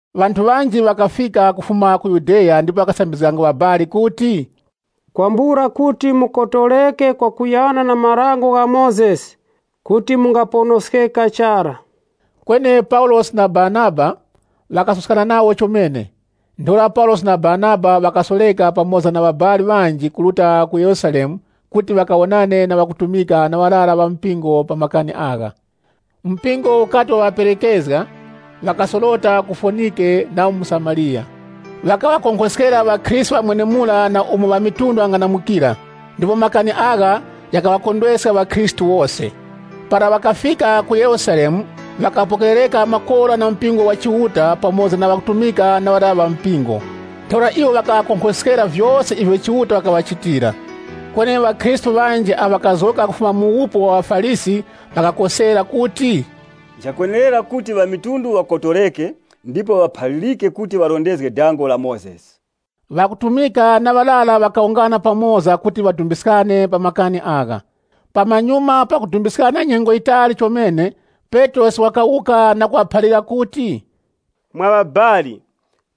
Ŵanthu ŵanji ŵakafika kufuma ku Yudeya ndipo ŵakasambizganga ŵabali kuti, “Kwambula kuti mukotoreke kwakuyana na Dango la Mozesi, kuti mungaponoskeka chara.” Kweni Paulosi na Baranaba ŵakasuskana nawo chomene. Ntheura Paulosi na Baranaba ŵakasoreka pamoza na ŵabali ŵanji kuruta ku Yerusalemu kuti ŵakawonane na ŵakutumika na ŵarara ŵa mpingo pa makani agha. Mpingo ukati waŵaperekezga, ŵakasorota mu Fonike na mu Samariya. Ŵakaŵakonkhoskera ŵakhristu ŵa mwenemura na umo ŵamitundu ŵang'anamukira, ndipo makani agha ghakaŵakondweska ŵakhristu wose. Para ŵakafika ku Yerusalemu, ŵakapokerereka makora na mpingo wa Chiuta pamoza na ŵakutumika na ŵarara ŵa mpingo. Ntheura iwo ŵakaŵakonkhoskera vyose ivyo Chiuta wakaŵachitira. Kweni ŵakhristu ŵanji awo ŵakapulikana kufuma mu wupu wa ŵaFarisi ŵakakosera kuti, “Nchakwenerera kuti ŵamitundu ŵakotoreke ndipo ŵaphalirike kuti ŵarondezge Dango la Mozesi.” Ŵakutumika na ŵarara ŵakawungana pamoza kuti ŵadumbiskane pa makani agha. Pamanyuma pakudumbiskana nyengo yitali chomene, Petrosi wakawuka na kuŵaphalira kuti, “Mwa ŵabali,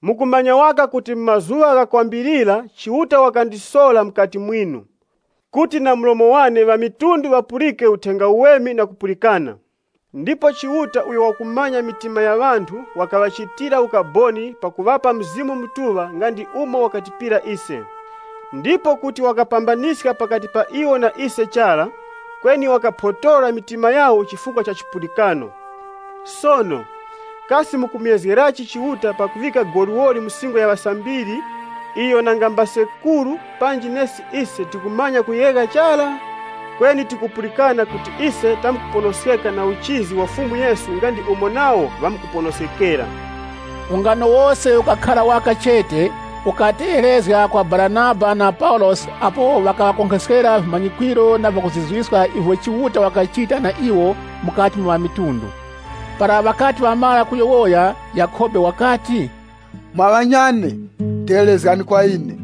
mukumanya waka kuti mu mazuŵa ghakwambilira Chiuta wakandisora mukati mwinu, kuti na mlomo wane ŵamitundu ŵapulike Uthenga Uweme na kupulikana. Ndipo Chiuta uyo wakumanya mitima ya ŵanthu wakaŵachitira ukaboni pakuŵapa Mzimu Mutuŵa nga ndi umo wakatipira ise. Ndipo kuti wakapambaniska pakati pa iwo na ise chara, kweni wakaphotora mitima yawo chifukwa cha chipulikano. Sono, kasi mukumuyezgerachi Chiuta pakuŵika goliwoli mu singo ya ŵasambiri, iyo nanga mbasekuru panji nesi ise tikamanya kuyegha chara? Kweni tikupulikana kuti ise tamkuponoskeka na uchizi wa Fumu Yesu nga ndi umo nawo ŵamkuponoskekera.” Ungano wose ukakhara waka chete, ukategherezga kwa Baranaba na Paulosi apo ŵakaŵakonkhoskera vimanyikwiro na vyakuzizwiska ivyo Chiuta wakachita na iwo mukati mwa ŵamitundu. Para ŵakati ŵamara kuyowoya, Yakhobe wakati, “Mwa ŵanyane, tegherezgani kwa ine.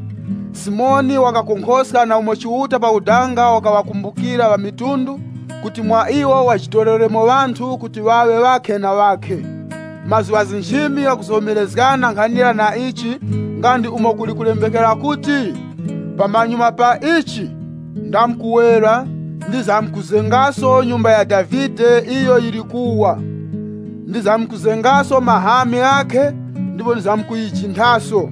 Simoni wakonkhoska na umo Chiuta pakudanga wakaŵakumbukira ŵamitundu, kuti mwa iwo wajitoreremo ŵanthu kuti ŵaŵe ŵakhe na ŵakhe. Mazgu gha nchimi ghakuzomerezgana nkhanira na ichi, nga ndi umo kuli kulembekera kuti, ‘Pamanyuma pa ichi, ndamkuwera, ndamkuzengaso ufumu wa Davide uwo uli kuwa. Ndamkuzengaso mahami ghakhe, ndipo ndamkuwukhozgaso. (LXX)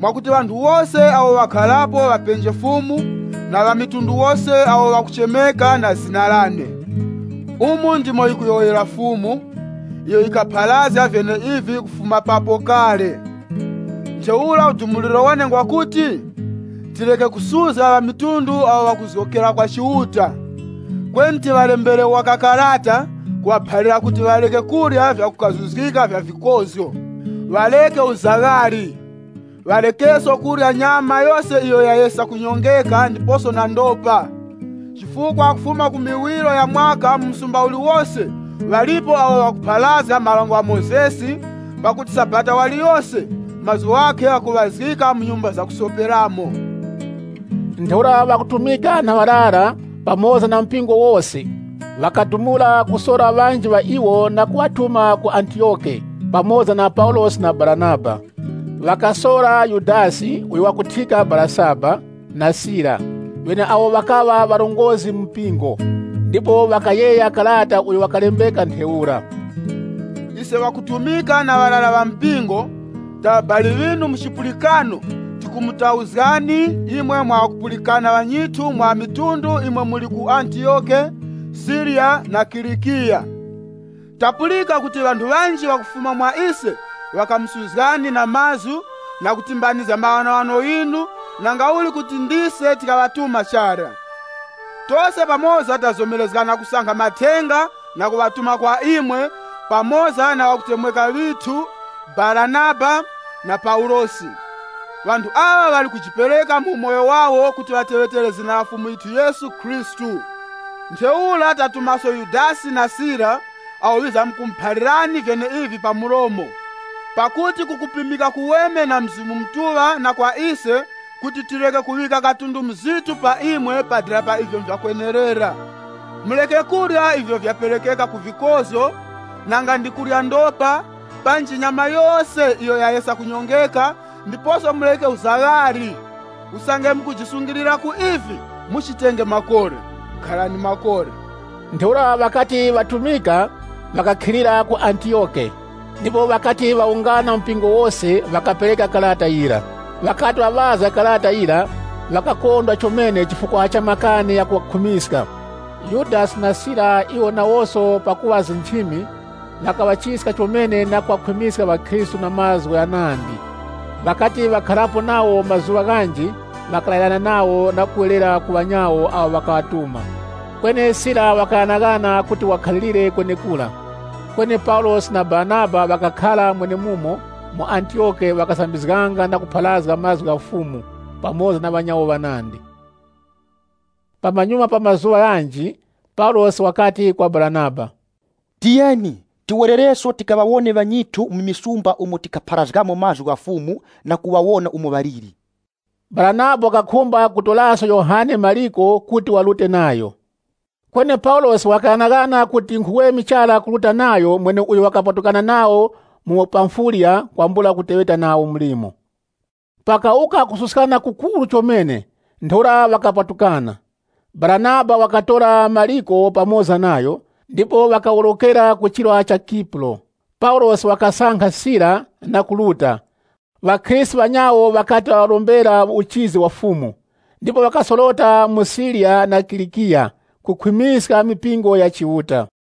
Mwakuti ŵanthu wose awo ŵakharapo ŵapenje Fumu, na ŵamitundu wose awo ŵakuchemeka na zina lane. Umu ndimo yikuyowoyera Fumu, iyo yikaghapharazga vyeneivi kufuma papo kale.’ “Ntheura udumuliro wane ngwa kuti, tireke kusuzga ŵamitundu awo ŵakuzgokera kwa Chiuta. Kweni tiŵalembere waka karata, kuŵaphalira kuti ŵareke kurya vyakukazuzgika vya vikozgo. Ŵareke uzaghali Ŵarekeso kurya nyama yose iyo yayesa kunyongeka, ndiposo na ndopa. Chifukwa kufuma ku miwiro ya mwaka mu msumba uliwose ŵalipo awo ŵakupharazga Dango la Mozesi, pakuti Sabata waliyose, mazgu ghakhe ghakuŵazgika mu nyumba zakusoperamo.” Ntheura ŵakutumika na ŵarara, pamoza na mpingo wose, ŵakadumula kusora ŵanji ŵa iwo na kuŵatuma ku Antiyoke, pamoza na Paulosi na Baranaba. Ŵakasora Yudasi, uyo wakuthyika Barasaba, na Sila, ŵeneawo ŵakaŵa ŵarongozgi mu mpingo, ndipo ŵakayegha karata uyo wakalembeka ntheura: “Ise ŵakutumika na ŵarara ŵa mpingo, ta ŵabali ŵinu mu chipulikano, tikumutauzgani imwe mwa ŵakupulikana ŵanyithu mwa ŵamitundu imwe muli ku Antiyoke, Siriya na Kilikiya. Tapulika kuti ŵanthu ŵanji ŵakufuma mwa ise ŵakamusuzgani na mazgu, na kutimbanizga maghanoghano ghinu, nangauli kuti ndise tikaŵatuma chara. Tose pamoza tazomerezgana kusankha mathenga na kuŵatuma kwa imwe, pamoza na ŵakutemweka ŵithu, Baranaba na Paulosi. Ŵanthu aŵa ŵali kujipereka mu umoyo wawo kuti ŵateŵetere zina la Fumu yithu Yesu Khristu. Ntheura tatumaso Yudasi na Sila awo ŵizamkumuphalirani vyeneivi pa mlomo. Pakuti kukupimika kuweme kwa Mzimu Mutuŵa na kwa ise kuti tireke kuŵika katundu muzitu pa imwe pa dera pa ivyo nvyakwenerera. Mureke kurya ivyo vyaperekeka ku vikozgo, nanga ndi kurya ndopa, panji nyama yose iyo yayesa kunyongeka, ndiposo mureke uzaghali. Usange mukujisungilira ku ivi, muchitenge makora. Kharani makora.” Ntheura ŵakati ŵatumika, ŵakakhilira ku Antiyoke. Ndipo ŵakati ŵawunganya mpingo wose, ŵakapereka karata yira. Ŵakati ŵaŵazga karata yira, ŵakakondwa chomene chifukwa cha makani ghakuŵakhwimiska. Yudasi na Sila iwo nawoso pakuŵa nchimi, ŵakaŵachiska chomene na kuŵakhwimiska ŵakhristu na mazgu ghanandi. Ŵakati ŵakharapo nawo mazuŵa ghanji ŵakalayirana nawo na kuwerera ku ŵanyawo awo ŵakaŵatuma. [ Kweni Sila wakaghanaghana kuti wakhalire kwenekura.] Kweni Paulosi na Baranaba ŵakakhara mwenemumo mu Antiyoke ŵakasambizganga na kupharazga mazgu gha Fumu, pamoza na ŵanyawo ŵanandi. Pamanyuma pa mazuŵa ghanji, Paulosi wakati kwa Baranaba, “Tiyeni, tiwerereso tikaŵawone ŵanyithu mu misumba umo tikapharazgamo mazgu gha Fumu, na kuŵawona umo ŵaliri.” Baranaba wakakhumba kutoraso Yohane Mariko kuti warute nayo. Kweni Paulosi wakaghanaghana kuti nkhuweme chara kuruta nayo mweneuyo wakapatukana nawo mu Pamfiliya kwambula kuteŵeta nawo mlimo. Pakawuka kususkana kukuru chomene, ntheura ŵakapatukana. Baranaba wakatora Mariko pamoza nayo, ndipo ŵakaworokera ku chirwa cha Kipuro. Paulosi wakasankha Sila, na kuruta, ŵakhristu ŵanyawo ŵakati ŵaŵarombera uchizi wa Fumu. Ndipo ŵakasorota mu Siriya na Kilikiya, kukhwimiska mipingo ya Chiuta.